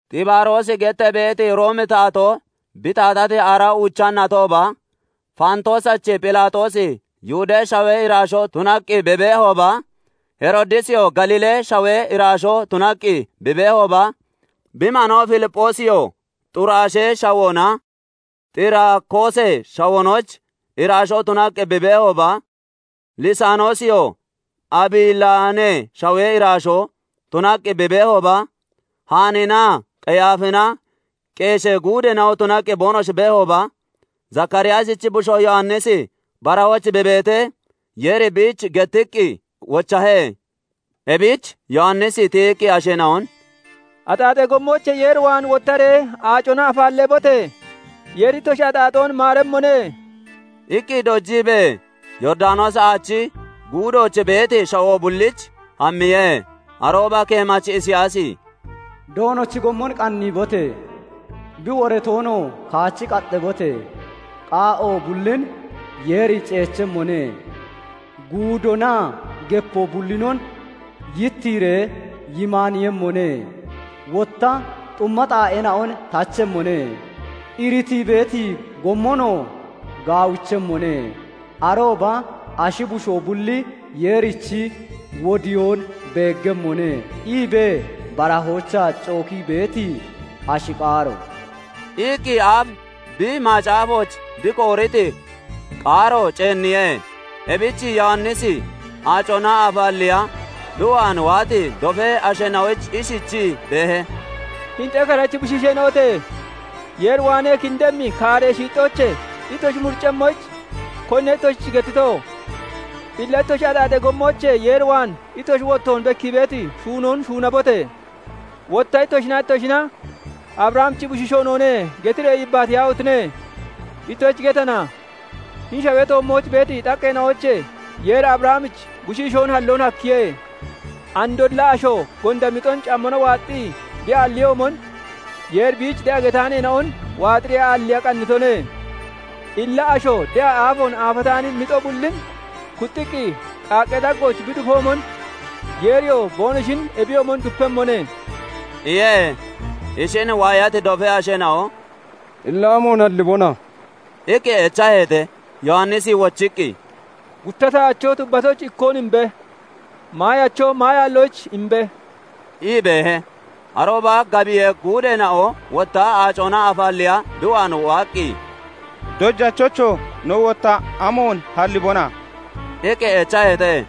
Xibaaroosi gettee beeti Roomi taatoo bi taatati aaraa uucha natooba, Faantoosachi Phelaaxoosi Yihudee Shawee iraashoo tunaqqi bi beehooba, Heroodisiyoo Galiilee shawee iraashoo tunaqqi bi beehooba, bi manoo Filipphoosiyoo Xuraashee shawoonaa Xiraakoosee shawoonochi iraashoo tunaqqi bi beehooba, Lisaanoosiyoo Abilaanee Shawee iraashoo tunaqqi bi beehooba, Haanninaa Qeyaafina Qeeshee guudeena'o tunaqqi boonoshi beehooba, Zakaariyaasichi bushoo Yowannisi barahooch bi beetee, Yeeri biich gettiqqi wochahe. Ebich Yowannisi tiyiqqi asheena'on "Axaaxee gommoochee Yeer waan wottaree aacona afaalleebote! Yeeri ittoshi axaaxoon maaremmone" iqqi dojiibee Yooridanoosi Aachi guudooch beeti shawoo bulliich hammiye. Arooba keemachi Isiyaasi " 'Doonochi gommon qanniibote! bi woratoonoo kaachi Kaxxabote! qaa'o bullin Yeeri ceechemmone; guudoonaa gepoo bullinon yittiiree yimaaniiyemmone; wotta xumma Xaaeena'on tachemmone; iritii beeti gommonoo gaawichemmone; arooba ashi bushoo bulli Yeerichi wodiyoon beeggemmone' iibee barahoochaa cookii beeti ashi qaaro" iqqi aaf bi macaafooch bi kooriti qaaro ceenniye. Ebich Yowannisi aacona afaalleeya bi waan waati dofee asheena'oyich ishichii beehe; "Hini xekarechi bushiisheena'ote! Yeer waanee kindemmi kaaree shiixxoochee ittoshi muriccemmoyich, konine ittoshich gettito? Illa ittoshi axaaxee gommoochee Yeer waan ittoshi wottoon bekkii beeti shuunoon shuunabote! Wotta ittoshinaa ittoshina 'Abrahamichi bushiishoo noone' getiree yebaniyaahotine! Ittoshich getana; hini shawee toommooch beeti xaqqeena'oochee Yeeri Abrahamich bushiishoon halloon hakkiye. Andolla asho gonda mixon cammona waaxxii bi aalliyoomon, Yeeri biich de'a getaaneena'on waaxiree aalliiya qannitone. Illa asho de'a aafoon aafataani mixo bullin kuxxiqqi qaaqqee daggooch bi dufoomon, Yeeriyoo boonoshin ebiyoomon dupehemmone" iye. Ishin waayati dofee asheena'o "Illa amoon hallibona?" iqqi echaheete. Yowannisi wochiqqi, "Gutta tahacho tubbatoyich ikkoon imbe! Maayacho maayaalloyich imbe!" ii beehe. Arooba gabiyee guudeena'o wotta aacona aafaalleeya bi waan waaqqi, "Dojachocho! No wotta amoon hallibona?" iqqi echaheete.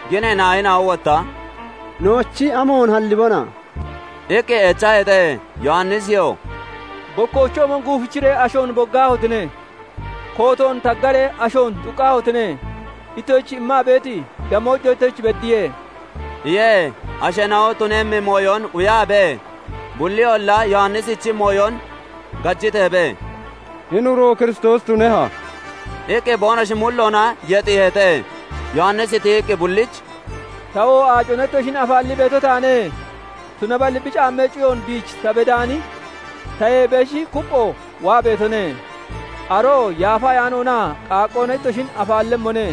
Ginee naayina'o wotta "Noochi, amoon hallibona?" iqqi echaheete. Yowanisiyoo "Bokkoochoomon guufichiree ashoon boggaahotine! Kootoon taggaree ashoon xuqqaahotine! Ittoshich immaa beeti damoojo ittoshich beddiye" iye. Asheena'o tunemmi mooyon quyaabee, bulliyolla Yowannisichi mooyon gajiteebee, "Hini uro Kiristoosi tuneha?" iqqi boonoshi mulloona yexiiheete. Yowannisi tiyiqqi bullich "Tawoo aacona ittoshin afaallii beeto taane. Tunaballi bi caammee cuyoon biich ta bedaani tayee beshi kuppho waa beetone; aroo Yaafa Ayaanoonaa qaaqqoona ittoshin afaallemmone.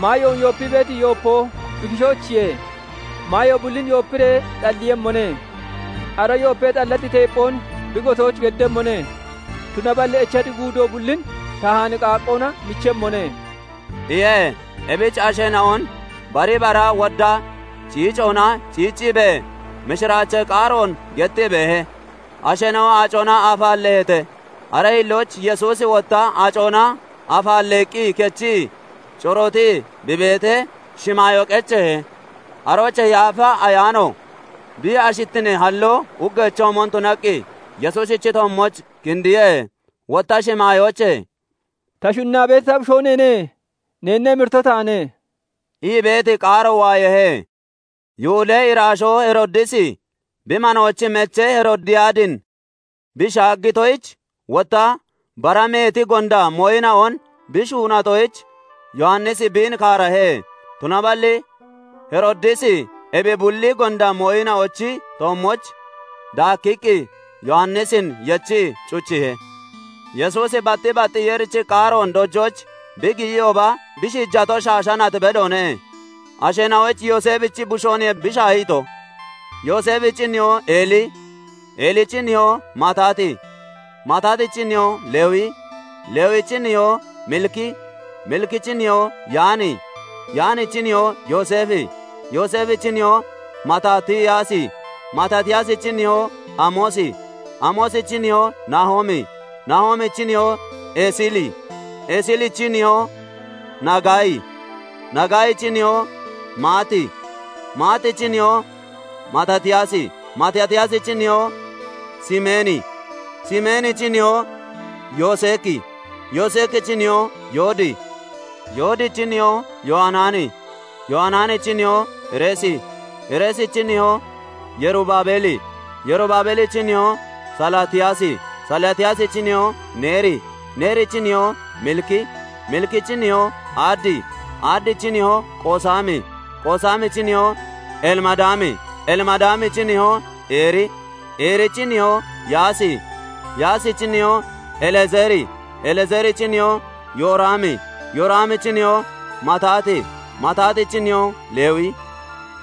Maayoon yoopii beeti yoopoo bi kishoochiye; maayo bullin yoopiree xalliiyemmone; ara yoopee xallati teepphoon bi gotooch geddemmone; tunaballi echati guudoo bullin tahaani qaaqqoona michemmone" iye. Ebich asheena'on bari bara wodda ciicoona ciicciibee mishiraachee qaaroon gettii beehe. Asheena'o aacona afaalleeheete; aree hillooch Yesuusi wotta aacona afaalleeqqi kechii corootii bi beetee, shimaayoo qecheehe; aroochee Yaafa Ayaano bi ashittinee halloo uggeechoomon tunaqqi Yesuusichi toommooch kindiye. Wotta shimaayoochee "Ta shunnaa beeti ta bushoo neene; neenna emirito taane" ii beeti qaaro waayeehe. Yihudee iraashoo Heroodisi, bi manoochi mechee Heroodiyaadin bi shaaggitoyich, wotta bara meeti gonda mooyina'on bi shuunatoyich, Yowannisi biin kaarahe; Tunaballi Heroodisi ebi bulli gonda mooyina'ochi toommooch daakkiqqi Yowannisin yechii cuchiihe. Yesuusi batti bat Yeerichi qaaroon dojooch bi giyiyooba, bi shiijato shaasha nat bedoone. Asheena'oyich Yooseefichi bushooniye bi shaahito; Yooseefichi nihoo Eeli, Eelichi nihoo Maatati, Maatatichi nihoo Lewi, Lewichi nihoo Miliki, Milikichi nihoo Yaani, Yaanichi nihoo Yooseefi, Yooseefichi nihoo Maatatiyaasi, Maatatiyaasichi nihoo Amoosi, Amoosichi nihoo Naahoomi, Naahoomichi nihoo Esili, Esilichi nihoo Nagaayi, Nagaayichi nihoo Maati, Maatichi nihoo Maatatiyaasi, Maatatiyaasichi nihoo Simeeni, Simeenichi nihoo Yoseeki, Yoseekichi nihoo Yoodi, Yoodichi nihoo Yowanaani, Yowanaanichi nihoo Reesi, Reesichi nihoo Yerubaabeli, Yerubaabelichi nihoo Salaatiyaasi, Salaatiyaasichi nihoo Neeri, Neerichi nihoo Miliki, Milikichi nihoo Adi, Adichi nihoo Qoosami, Qoosamichi nihoo Elimadaami, Elimadaamichi nihoo Eeri, Eerichi nihoo Yaasi, Yaasichi nihoo Elezeeri, Elezeerichi nihoo Yooraami, Yooraamichi nihoo Maatati, Maatatichi nihoo Lewi,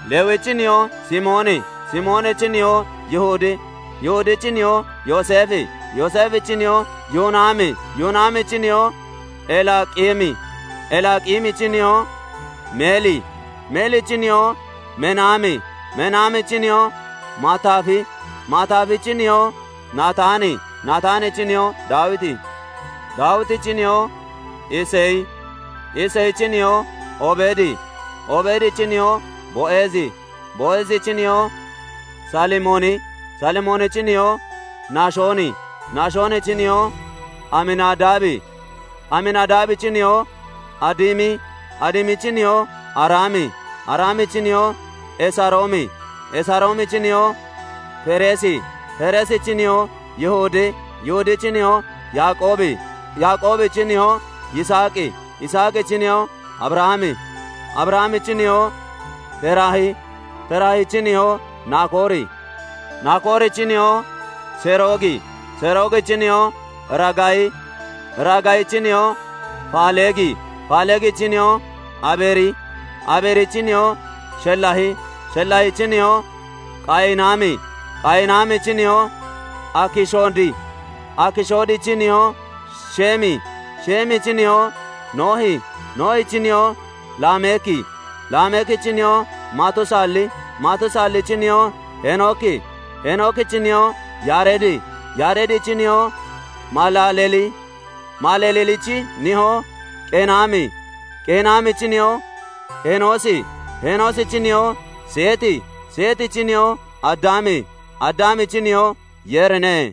Lewichi nihoo Simooni, Simoonichi nihoo Yihudi, Yihudichi nihoo Yooseefi, Yooseefichi nihoo Yoonaami, Yoonaamichi nihoo Elaaqimi, Elaaqimichi nihoo Meeli, Meelichi nihoo Menaami, Menaamichi nihoo Maataafi, Maataafichi nihoo Naataani, Naataanichi nihoo Daawiti, Daawitichi nihoo Iseyi, Iseyichi nihoo Obeedi, Obeedichi nihoo Bo'eezi, Bo'eezichi nihoo Saalimooni, Saalimoonichi nihoo Nahishooni, Nashoonchi nihoo Aminadaabi, Aminadaabichi nihoo Adimi, Adimichi nihoo Araami, Araamichi nihoo Esaroomi, Esaroomichi nihoo Fereesi, Fereesichi nihoo Yihudi, Yihudichi nihoo Yaaqoobi, Yaaqoobichi nihoo Yisaaqi, Yisaaqichi nihoo Abrahami, Abrahamichi nihoo Teraahi, Teraahichi nihoo Nakoori, Nakoorichi nihoo Seroogi, Seroogichi nihoo Raagayi, Raagayichi nihoo Faaleegi, Faaleegichi nihoo Abeeri, Abeerichi nihoo Shelaahi, Shelaaichi nihoo Qayinaami, Qayinaamichi nihoo Akishoodi, Akishoodichi nihoo Sheemi, Sheemichi nihoo Noohi, Noohichi nihoo Lameeki, Lameekichi nihoo Matusaali, Matusaalichi nihoo Heenooki, Heenookichi nihoo Yaareedi, Yaareedichi nihoo Malaaleli, Malaalelichi nihoo Qeenaami, Qeenaamichi nihoo Henoosi, Henoosichi nihoo Seeti, Seetichi nihoo Addaami, Addaamichi nihoo Yeerine.